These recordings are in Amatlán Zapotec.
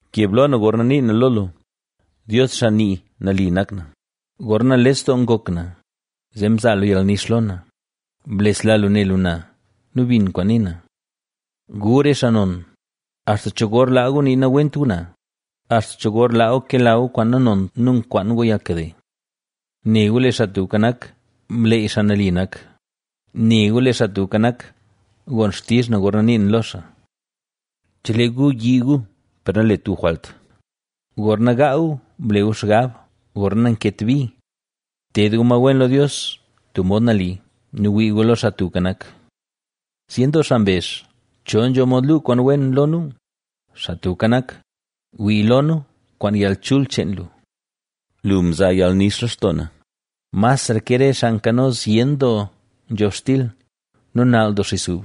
¡Keb lo na gorna nii na lo lu, Dios xaa nii nali nak na; gorna nales doo ngok na, zee mzaa lu yalnix lo na, blesla lu ne lu na nu bin kwaan nii na! Gu re xaa non, ¿axta cho gor laa gu nii nawent gu na? ¿Axta cho gor laa gu kela gu kwaan nanont nu nkwaan gu yalnkade? Ne gu, lee Xaa Tubka Nak, mleey xaa nali nak, Ne gu, lee Xaa Tubka Nak, gon xtizh na gorna nii na lo xaa. ¡Chelee gu yii gu, per nalet gu jwalt! Gorna gaa gu, ble gu xgab, gorna nanket bi. Ted gu ma wen lo Dios tub mod nali nu wii gu lo Xaa Tubka Nak. Zyen doo xaa mbezh: “¿Cho nzho mod luu kwaan wen lo nu?” Xaa Tubka Nak, wii lo nu kwaan yalchul cheen lu. Lu mzaa yalnix lextoo na, masra ke re xaa nkano zyen doo nzhobxtil nu nall doo xis ub.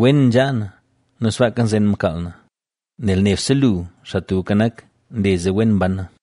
Wen nzhaa na nu sbaaka nzen mkaal na, nel nebse lu, Xaa Tubka Nak, nle zee wen mban na.